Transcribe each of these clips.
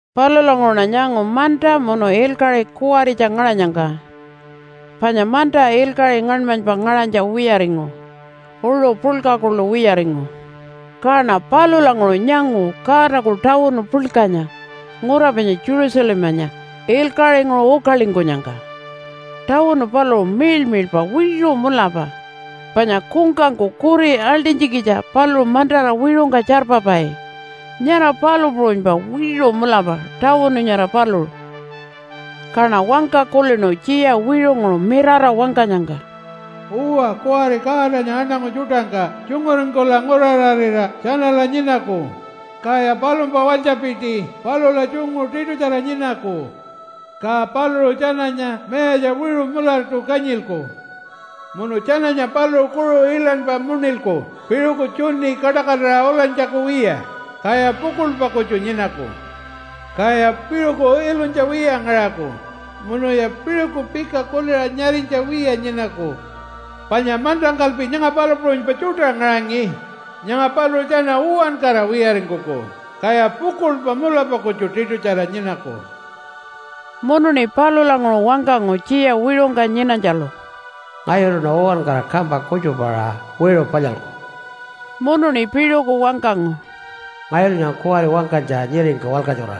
Palulanguṟuṉa nyangu manta munu ilkaṟi kuwaritja ngaṟanyangka. Panya manta ilkaṟi ngaṉmanypa ngaṟanytja wiyaringu, uṟu puḻka kuḻu wiyaringu. Kaṉa palulanguṟu nyangu Godaku tawunu puḻkanya ngura panya Jerusalemanya ilkaṟinguṟu ukalingkunyangka. Tawunu paluṟu miḻmiḻpa wiṟu mulapa. Panya kungkangku kuri aḻṯinytjikitja paluṟu mantara wiṟungka tjarpapai, nyara palu puṟunypa wiṟu mulapa tawunu nyara paluṟu. Kaṉa wangka kulinu tjiya wiṟunguṟu mirara wangkanyangka, “Uwa, kuwari Godanya aṉangu tjuṯangka tjunguringkula nguraṟarira tjanala nyinaku, kaya palumpa walytjapiti palula tjungu tiṯutjara nyinaku. Ka paluṟu tjananya mayatja wiṟu mulatu kanyilku, munu tjananya paluṟu kuṟu iḻanypa muṉilku piṟuku tjuni kaṯakatira ulanytjaku wiya, kaya pukuḻpa kutju nyinaku. Kaya piṟuku ilunytja wiya ngaṟaku munuya piṟuku pika kuliṟa nyarinytja wiya nyinaku. Panya mantangkalpi nyanga palu puṟunypa tjuṯa ngaṟangi, nyanga paluṟu tjana uwankara wiyaringkuku kaya pukuḻpa mulapa kutju tiṯutjara nyinaku.” Munuṉi palulanguṟu wangkangu tjiya wiṟungka nyinanytjalu, “Ngayuluṉa uwankara kampa kutjupaṟa wiṟu palyalku.” Munuṉi piṟuku wangkangu, “Ngayulu nyanga kuwari wangkanytja nyiringka walkatjura,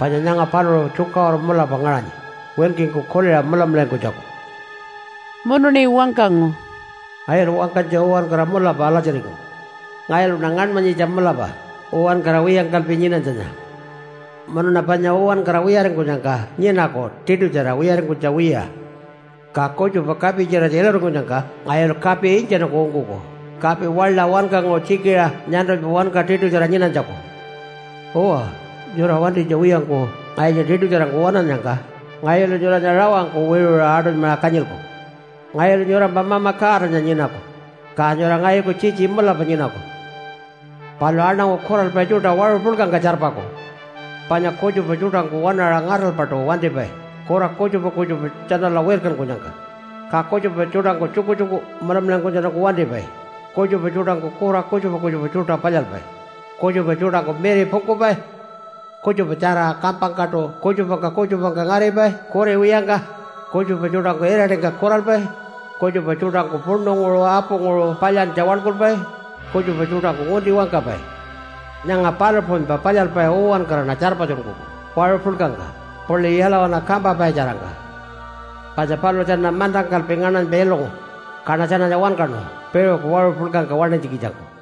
panya nyanga paluṟu tjukaṟuru mulapa ngaṟanyi winkingku kuliṟa mulamularingkunytjaku.” Munuṉi wangkangu, “Ngayulu wangkanytja uwankara mulapa alatjiringu. Ngayuluṉa ngaṉmanyitja mulapa uwankara wiyangkalpi nyinanytjanya, munuṉa panya uwankara wiyaringkunyangka nyinaku tiṯutjara wiyaringkunytja wiya. Ka kutjupa kapi-tjiratja iluringkunyangka ngayulu kapi intjanungku ungkuku kapi waḻa wankanguṟu tjikiṟa nyantulpa wanka tiṯutjara nyinanytjaku. Uwa, nyura wantinytja wiyangku ngayunya tiṯutjarangku waṉannyangka ngayulu nyuranya rawangku wiṟuṟa aṯunymaṟa kanyilku. Ngayulu nyurampa Mama Godanya nyinaku, ka nyura ngayuku tjitji mulapa nyinaku. “Palu aṉangu kuralpai tjuṯa waṟu puḻkangka tjarpaku. Panya kutjupa tjuṯangku waṉaṟa ngaṯalpaṯu wantipai kura kutjupa kutjupa tjanala wirkankunyangka, ka kutjupa tjuṯangku tjukutjuku mulamularingkunytjatjanungku wantipai, kutjupa tjuṯangku kura kutjupa kutjupa tjuṯa palyalpai, kutjupa tjuṯangku miripungkupai, kutjupatjara kampangkaṯu kutjupangka kutjupangka ngaripai kuri wiyangka, kutjupa tjuṯangku iraṯingka kuralpai, kutjupa tjuṯangku puṉunguṟu apunguṟu palyantja waḻkulpai, kutjupa tjuṯangku ngunti wangkapai. Nyanga palu puṟunypa palyalpai uwankaraṉa tjarpatjunkuku waṟu puḻkangka puḻi yalawana kampapai-tjarangka. Panya paluṟu tjana mantangkalpi ngaṉmanypa ilungu, kaṉa tjananya wankaṉu piṟuku waṟu puḻkangka waṉinytjikitjangku.”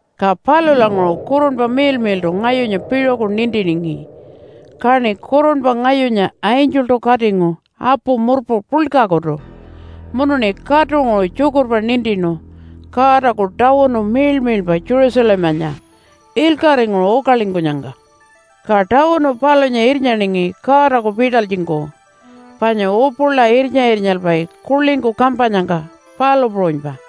Ka palulanguṟu Kurunpa Miḻmiḻṯu ngayunya piṟuku nintiningi, kaṉi kurunpa ngayunya angeltu katingu apu murpu puḻkakutu munuṉi katunguṟu tjukurpa nintinu Godaku tawunu miḻmiḻpa Jerusalemanya ilkaṟinguṟu ukalingkunyangka. Ka tawunu palunya irnyaningi Godaku pitalytjingku, panya upula irnya-irnyalpai kuḻingku kampanyangka, palu puṟunypa.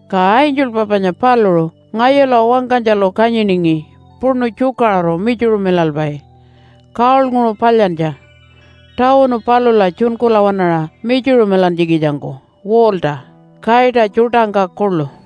Ka angelpa panya paluṟu ngayula wangkanytjalu kanyiningi puṉu tjukaṟuru mitjuṟumilalpai gold-nguṟu palyantja tawunu palula tjunkula waṉaṟa mitjuṟumilantjikitjangku wall-ta kaita tjuṯangka kuḻu.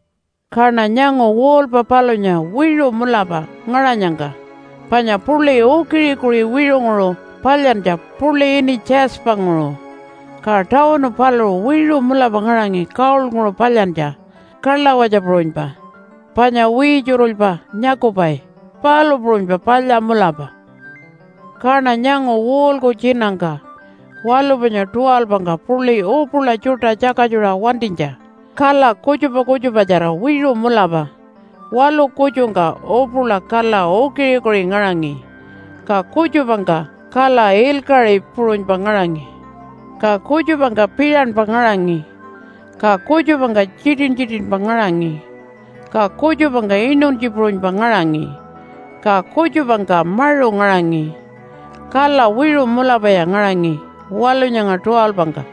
Kaṉa nyangu wall-pa palunya wiṟu mulapa ngaṟanyangka panya puḻi ukiṟi-ukiṟi wiṟunguṟu palyantja puḻi ini Jasper-nguṟu. Ka tawunu paluṟu wiṟu mulapa ngaṟangi gold-nguṟu palyantja kalawatja puṟunypa panya wiitjurulypa nyakupai, palu puṟunypa palya mulapa. Kaṉa nyangu wall-ku tjinangka waḻu panya 12-ngka puḻi upula tjuṯa tjakatjuṟa wantinytja kala kutjupa kutjupatjara wiṟu mulapa. Waḻu kutjungka upula kala ukiṟi-ukiṟi ngaṟangi, ka kutjupangka kala ilkaṟi puṟunypa ngaṟangi, ka kutjupangka piṟanpa ngaṟangi, ka kutjupangka tjitin-tjitinpa ngaṟangi, ka kutjupangka inuntji puṟunypa ngaṟangi ka kutjupangka maṟu ngaṟangi. Kala wiṟu mulapaya ngaṟangi waḻu nyanga 12-ngka.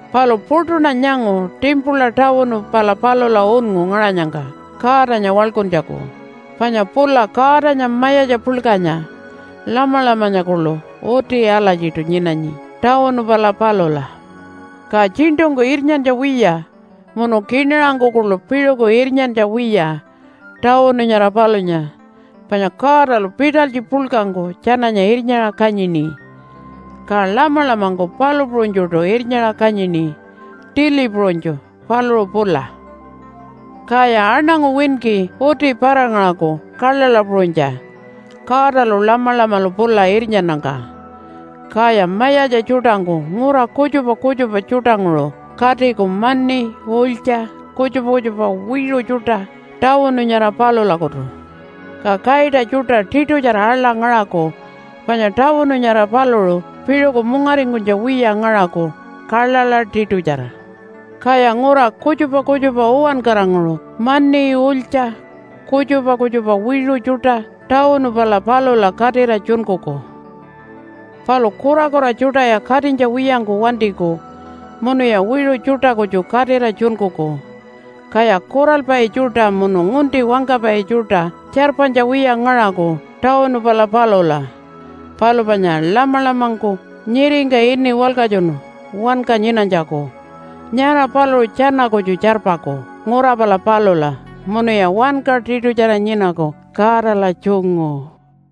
Palu puṯuṉa nyangu timpula tawunu pala palula unngu ngaṟanyangka Godanya waḻkuntjaku, panya pula Godanya Mayatja Puḻkanya Lamalamanya kuḻu uti alatjiṯu nyinanyi tawunu pala palula. Ka tjiṉṯungku irnyantja wiya munu kiṉaṟangku kuḻu piṟuku irnyantja wiya tawunu nyara palunya, panya Godalu pitalytji puḻkangku tjananya irnyaṟa kanyini. Ka Lamalamangku palu puṟunytjuṯu irnyaṟa kanyini tili puṟunytju, paluṟu pula. Kaya aṉangu winki uti para-ngaṟaku kaḻaḻa puṟunytja Godalu Lamalamalu pula irnyannyangka. Kaya mayatja tjuṯangku ngura kutjupa kutjupa tjuṯanguṟu katiku mani, ulytja, kutjupa kutjupa wiṟu tjuṯa tawunu nyara palulakutu. Ka kaita tjuṯa tiṯutjara aḻa ngaṟaku panya tawunu nyara paluṟu piṟuku mungaringkunytja wiya ngaṟaku kaḻaḻa tiṯutjara. Kaya ngura kutjupa kutjupa uwankaranguṟu mani, ulytja, kutjupa kutjupa wiṟu tjuṯa tawunu pala palula katira tjunkuku. Palu kurakura tjuṯaya katinytja wiyangku wantiku munuya wiṟu tjuṯa kutju katira tjunkuku. Kaya kuralpai tjuṯa munu ngunti wangkapai tjuṯa tjarpanytja wiya ngaṟaku tawunu pala palula. Palu panya Lamalamangku nyiringka ini walkatjunu wanka nyinanytjaku, nyara paluṟu tjana kutju tjarpaku ngura pala palula, munuya wanka tiṯutjara nyinaku Godala tjungu.